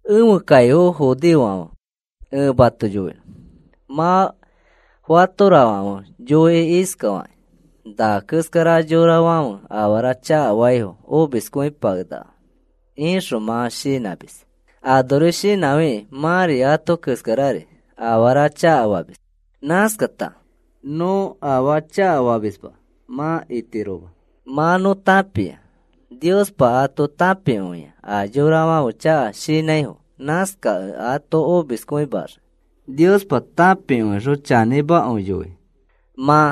Ẽfe kaifo judeofãfe, ẽ mato yoinõ. Mã fatorafãfe yoi iskakĩ: “Na keskara yorafãfe afara chakafaifo omiskõipakenakafo,” ixõ mã shinãmis. Anori shinãfikĩ mãri ato keskarari afara chakafamis. Nãskata, “Nõ afaa chakafamisma,” mã itiroma. Mã nõ tãpia, Niospa ato tãpikõia a yorafãfe chaka shinãifo. Nãskakẽ ato omiskõimaxii. Niospa tãpikõixõ chanĩmakõi yoi. Mã,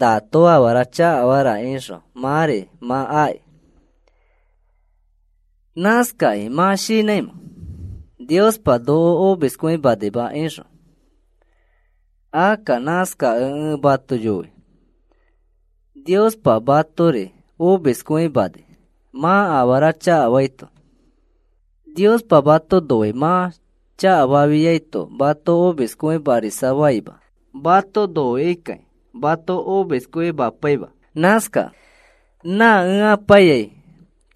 “Nato afara chakafara,” ixõ mãri mã aki. ¿Nãskakĩ mã shinãimẽ: “Niospa noko omiskõimanima,” ixõ? Akka nãskakẽ ẽ mato yoi. Niospa matori omiskõimani mã afara chakafaito. Niospa mato noi. Mã chakafafiaito mato omiskõimarisafaima. Mato noikikai mato omiskõimapaima. Nãskakẽ, “¿Nã ẽ ipaiyai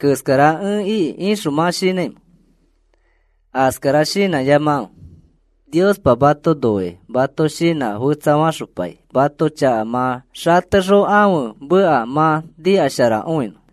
keskara ẽ iki,” ixõ mã shinãimẽ? Askara shinãyamakãfe. Niospa mato noikĩ mato shinã fetsafaxopai mãto chaka mã xatexõ ãfe meka mã nikasharakõinõ.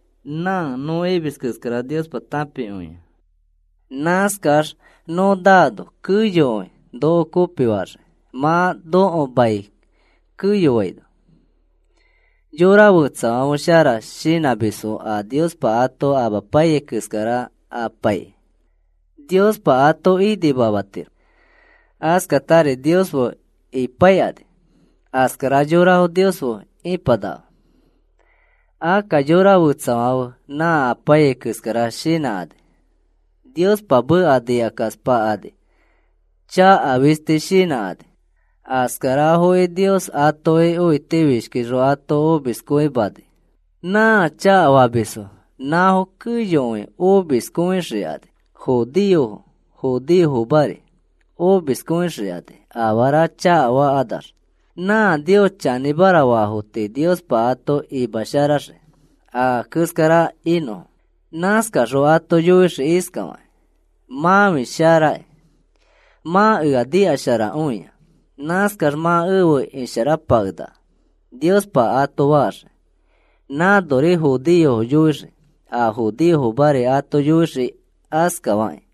Nã nõ imis keskara Niospa tãpikõia. Nãskax nõ naano keyokõi noko kopifaxii mã nõko mai keyoaino. Yora fetsafãfe shara shinãmisfo a Niospa ato amapaiyai keskara apaikĩ. Niospa ato inimamatiro. Askatari Nios fe ipaikani. Askara yorafo Nios fe ipanakafo. Akka yora fetsafãfe nã apaiyai keskara shinãkani. Niospa meka nikakaspakani. Chaka fisti shinãkani. Askarafoki Nios atoki õitifishkixõ ato omiskõimani. Nã chakafamisfo nãfo keyokõi omiskõixikani, judeofo, judeofomari omiskõixikani afara chakafakanax. Nã Nios chanĩmara faafo tii Niospa ato imasharaxii a keskara inõfo. Nãskaxõ ato yoixii iskafakĩ: “Mãfi sharaki. Mã ea nikasharakõia. Nãskax mã efe isharapakenaka,” Niospa ato faxii. Nãnori judeofo yoixii. A judeofomari ato yoixii askafakĩ.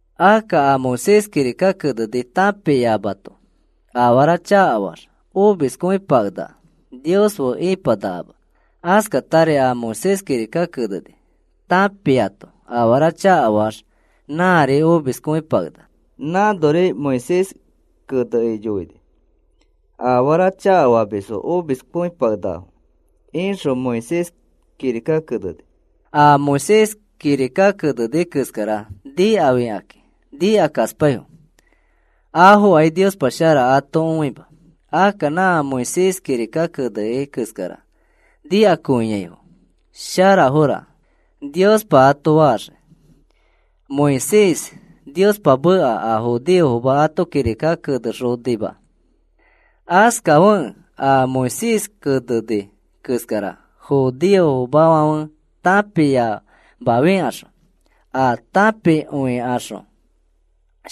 Akka a Moisés kirika keneni tãpiamato afara chakafaax omiskõipakenaka. Nios fe ipanakama. Askatari a Moisés kirika keneni tãpiato afara chakafaax nãri omiskõipakenaka. Nãnori Moisés kenekĩ yoini: “A afara chakafamisfo omiskõipakenakafo,” ixõ Moisés kirika keneni. A Moisés kirika keneni keskara nikafikakĩ nikakaspaifo. Afokai Niospa shara ato õima. Akka nã Moisés kirika keneni keskara nikakõiaifo, “Sharafora,” Niospa ato faxii. Moisés Niospa meka a judeofoma ato kirika kenexonima. Askafekẽ a Moisés keneni keskara judeofomafãfe tãpiamafikaxõ ãa tãpikõikaxõ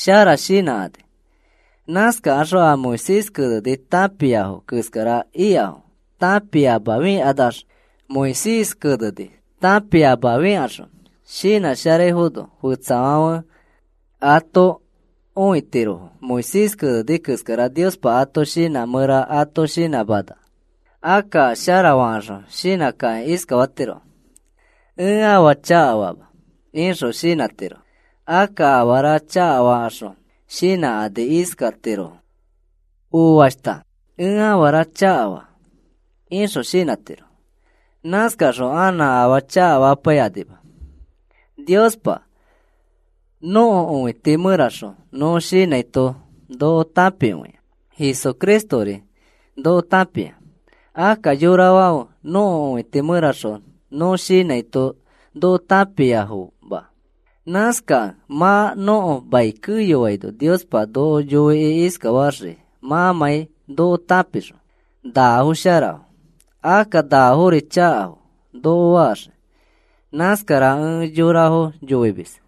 shara shinãkani. Nãskakaxõ a Moisés keneni tãpiafo keskara ikafo tãpiamafikanax. Moisés keneni tãpiamafikaxõ shinãsharaifono fetsafãfe ato õitirofo Moisés keneni keskara Niospa ato shinã mẽra ato shinãmana. Akka sharafakaxõ shinãkakĩ iskafatirofo: “Ẽ afaa chakafama,” ixõ shinãtirofo. Akka afara chakafaxõ shinãkani iskatirofo: “Oashta, ẽ afara chakafaa,” ixõ shinãtirofo. Nãskaxõ anã afaa chakafapaikanima. Niospa nõko õiti mẽraxõ nõ shinãito noko tãpikõia. Jesucristori noko tãpia. Akka yorafãfe nõko õiti mẽraxõ nõ shinãito noko tãpiafoma. Nãskakẽ mã nõko mai keyoaino Niospa noko yoikĩ iskafaxii mãmãi noko tãpixõ: “Nafo sharafo. Akka nafori chakafo,” noko faxii. Nãskara ẽ yorafo yoimis.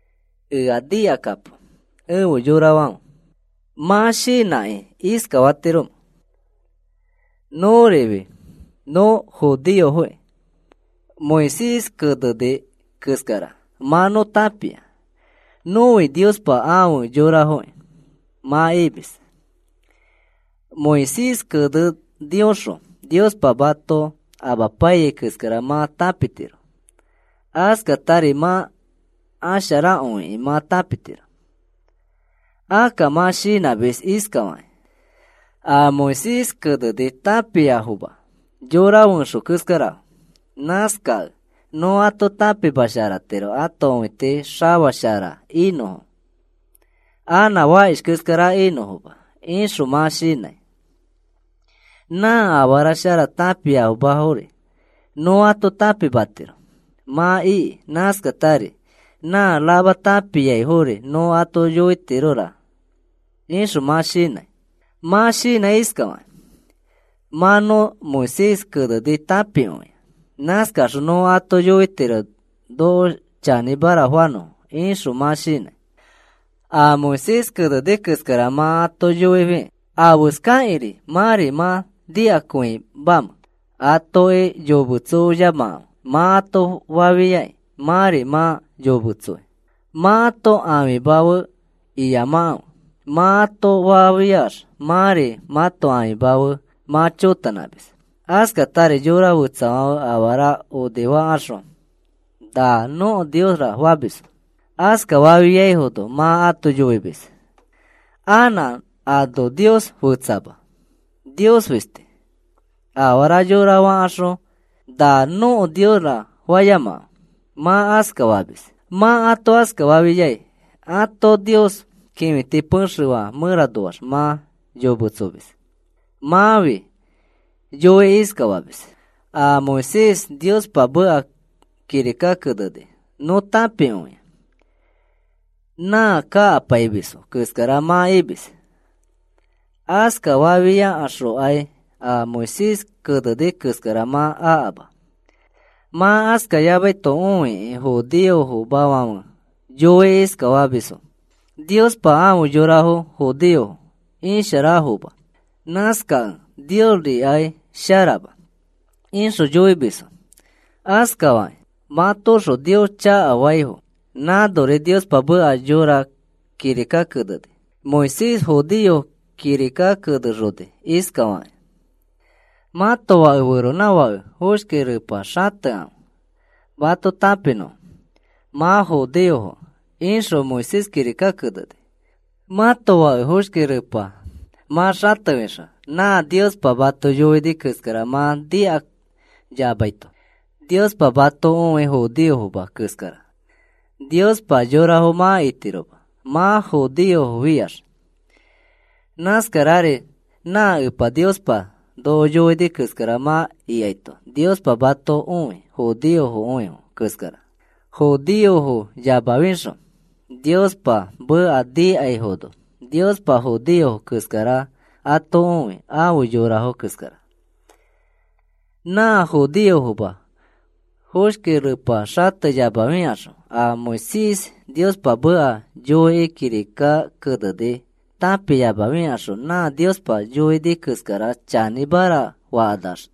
Ea nikakapo, efe yorafãfe. ¿Mã shinãkĩ iskafatiromẽ? “Nõrifi nõ judeofoki. Moisés keneni keskara mã nõ tãpia. Nõfi Niospa afe yorafoki,” mã imis. Moisés kenenioxõ Niospa mato amapaiyai keskara mã tãpitiro. Askatari mã asharakõikĩ mã tãpitiro. Akka mã shinãmis iskafakĩ: “A Moisés keneni tãpiafoma yora fẽxo keskarafo. Nãskakẽ nõ ato tãpimasharatiro ãto õiti xafa shara inõfo, anã fakish keskara inõfoma,” ixõ mã shinãi. “Nã afara shara tãpiamafori nõ ato tãpimatiro,” mã iki. Nãskatari, “Nã rama tãpiaifori nõ ato yoitirora,” ixõ mã shinãi. Mã shinãi iskafakĩ: “Mã nõ Moisés keneni tãpikõia. Nãskaxõ nõ ato yoitiro noko chanĩmara fanõfo,” ixõ mã shinãi. A Moisés keneni keskara mã ato yoifikĩ, ¿afeskakĩri mãri mã nikakõimamẽ? “Atoki yometsoyamakãfe,” mã ato fafiai mãri mã yometsoi. “Mãto ãfima fe iyamakãfe,” mã ato fafiax mãri mãto ãfima fe mã chotanãmis. Askatari yora fetsafãfe afara onifakaxõ, “Na nõko niosra,” famisfo. Askafafiaifono mã ato yoimis: “Anã ano Nios fetsama. Nios fisti. Afara yora faxõ, ‘Na nõko niosra,’ fayamakãfe,” mã askafamis. Mã ato askafafiai ãto nios kĩfiti pexefã mẽranoax mã yometsomis. Mãfi yoikĩ iskafamis: “A Moisés Niospa meka kirika keneni nõ tãpikõia,” nã kakapaimisfo keskara mã imis. Askafafiaxõkai a Moisés keneni keskara mã akama. Mã askayamaito õikakĩ judeofomafãfe yoikĩ iskafamisfo: “Niospa afe yorafo judeofo isharafoma. Nãskakẽ Niosrikai sharama,” ixõ yoimisfo. Askafakĩ matoõxõ Nios chakafaifo. Nãnori Niospa meka yõra kirika keneni. Moisés judeofo kirika kenexoni iskafakĩ: “Mãto fake feronãfakefo foshki repa xatekãfe mato tãpinõfo mã judeofokẽ,” ixõ Moisés kirika keneni. Mãto fake foshki repa mã xatefixõ nã Niospa mato yoini keskara mã nikayamaito Niospa mato õi judeofoma keskara. Niospa yorafo mã itiroma mã judeofofiax. Nãskarari nã Epa Niospa noko yoini keskara mã ikaito Niospa mato õi judeokõifo keskara. Judeofoyamafixõ Niospa meka nikaifono Niospa judeofo keskara ato õi afe yorafo keskara. Nã judeofoma foshki repa xateyamafikaxõ a Moisés Niospa meka yoikĩ kirika keneni tãpiyamafikaxõ nã Niospa yoini keskara chanĩmara fakanax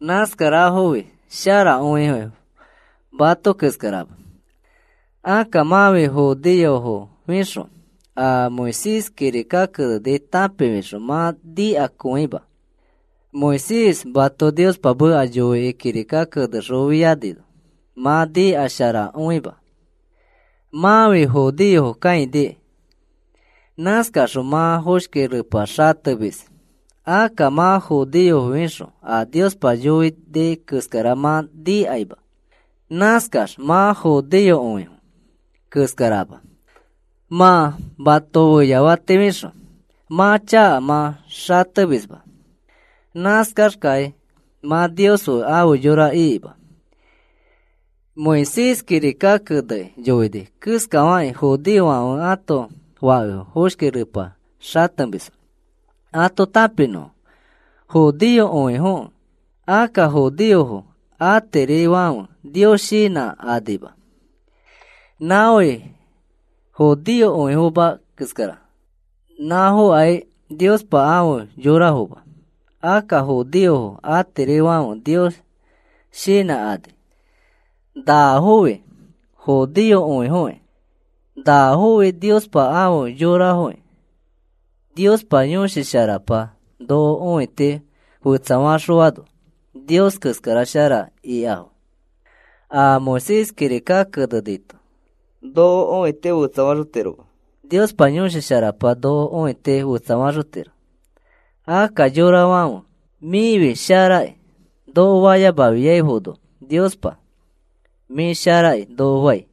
nãskarafofi sharafoki mato keskarama. Akka mãfi judeofofixõ a Moisés kirika keneni tãpifixõ mã nikakõima. Moisés mato Niospa meka yoikĩ kirika kenexofianino mã nikasharakõima. Mãfi judeofo kãinikĩ. Nãskaxõ mã foshki repa xatemis. Akka mã judeofofixõ a Niospa yoini keskara mã nikaima. Nãskax mã judeokõifo keskarama. Mã mãto feyafatifixõ mãto chaka mã xatemisma. Nãskaxkai mã Niospa afe yora ikima. Moisés kirika kenekĩ yoini keskafakĩ judeofãfe ãto fakefo foshki repa xatemisfo ato tãpinõfo judeokõifokẽ. Akka judeofo atirifãfe Nios shinãkanima. Nãfofi judeomakõifo keskara. Nãfokai Niospa afe yorafoma. Akka judeofo atirifãfe Nios shinãkani. Nãfofi judeokõifokĩ. Nãfofi Niospa afe yorafokĩ. Niospa Yõshi Sharapa noko õiti fetsafaxõano Nios keskara shara ikafo. A Moisés kirika kenenito noko õiti fetsafaxotiroma. Niospa Yõshi Sharapa noko õiti fetsafaxotiro. Akka yorafãfe, “Mĩfi sharakĩ,” noko fayamafiaifono Niospa, “Mĩ sharakĩ,” noko fai.